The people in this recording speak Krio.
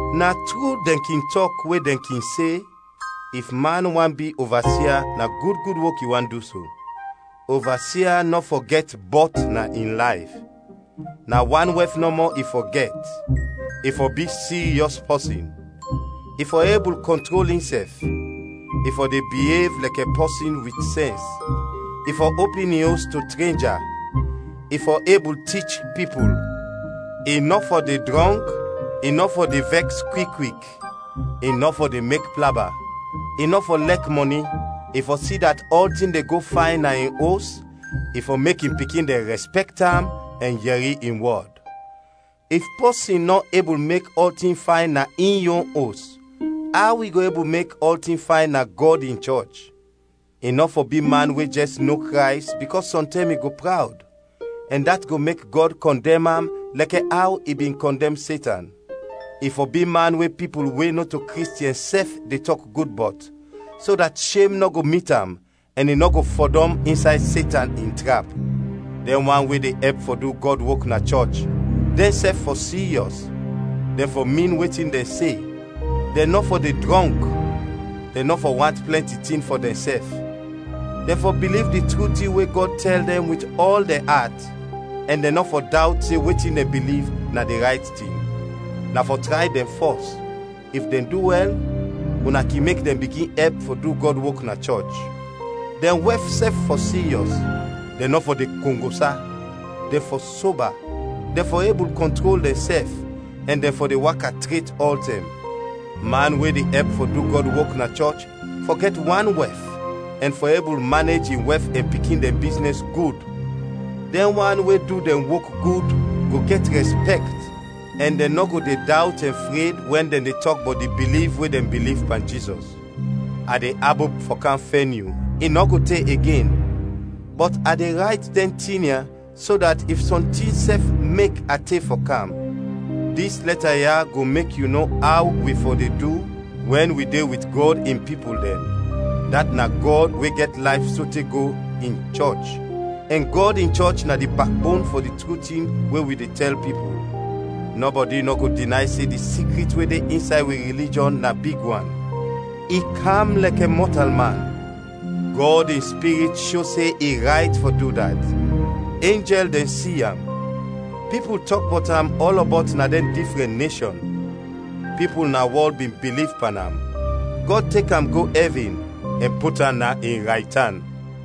Na tru dɛn kin tɔk we dɛn kin se: If man want bi ovasia na gud gud wok i want du so. Ovasia nɔ fɔ gɛt bɔt na in layf; na wan wɛf nɔmɔ i fɔ gɛt, i fɔ bi siryɔs pɔsin, i fɔ ebul kɔntrol insɛf, i fɔ de biev lɛkɛ pɔsin wit sɛns; i fɔ opin in os to trenja; i fɔ ebul tich pipul; i nɔ fɔ de drɔnk, i nɔ fɔ de vɛks kwik kwik, i nɔ fɔ de mek plaba; i nɔ fɔ lɛk mɔni; i fɔ si dat ɔltin de go fayn na in os, i fɔ mek in pikin dɛn rɛspɛkt am ɛn yɛri in wɔd. If pɔsin nɔ ebul mek ɔltin fayn na in yon os, aw i go ebul mek ɔltin fayn na Gɔd in chɔch? I nɔ fɔ bi man we jɛs no Krays bikɔs sɔntɛm i go prawd, ɛn dat go mek Gɔd kɔndɛm am lɛkɛ aw i bin kɔndɛm Setan. I fɔ bi man we pipul we nɔto Kristiɛn sɛf de tɔk gud bɔt, so dat shem nɔ go mit am ɛn i nɔ go fɔdɔm insay Setan in trap. Dɛn wan we de ɛp fɔ du Gɔd wok na chɔch, dɛnsɛf fɔ siryɔs, dɛn fɔ min wetin dɛn se; dɛn nɔ fɔ de drɔnk, dɛn nɔ fɔ want plɛnti tin fɔ dɛnsɛf; dɛn fɔ biliv di tru tin we Gɔd tɛl dɛn wit ɔl dɛn at; ɛn dɛn nɔ fɔ dawt se wetin dɛn biliv na di rayt tin. Na fɔ tray dɛn fɔs, if dɛn du wɛl, una kin mek dɛn bigin ɛp fɔ du Gɔd wok na chɔch. Dɛn wɛf sɛf fɔ siryɔs, dɛn nɔ fɔ de kongosa; dɛn fɔ soba, dɛn fɔ ebul kɔntrol dɛnsɛf, ɛn dɛn fɔ de waka tret ɔltɛm. Man we de ɛp fɔ du Gɔd wok na chɔch fɔ gɛt wan wɛf ɛn fɔ ebul manej in wɛf ɛn pikin dɛn biznɛs gud. Dɛn wan we du dɛn wok gud go gɛt rɛspɛkt ɛn dɛn nɔ go de dawt ɛn fred wɛn dɛn de tɔk bɔt di biliv we dɛn biliv pan Jizɔs. A de abop fɔ kam fɛn yu, i nɔ go te igen, bɔt a de rayt dɛn tin ya so dat if sɔntin sɛf mek a te fɔ kam, dis lɛta ya go mek yu no aw wi fɔ de du wɛn wi de wit Gɔd in pipul dɛn, dat na Gɔd we gɛt layf sote go, in chɔch, ɛn Gɔd in chɔch na di bakbon fɔ di tru tin we wi de tɛl pipul. Nɔbɔdi nɔ go dinay se di sikrit we de insay wi rilijɔn na big wan: I kam lɛkɛ mɔtalman, Gɔd in Spirit sho se i rayt fɔ du dat. Enjɛl dɛn si am. Pipul tɔk bɔt am ɔlɔbɔt na dɛn difrɛn neshɔn. Pipul na wɔl bin biliv pan am, Gɔd tek am go ɛvin, ɛn put am na in raytan.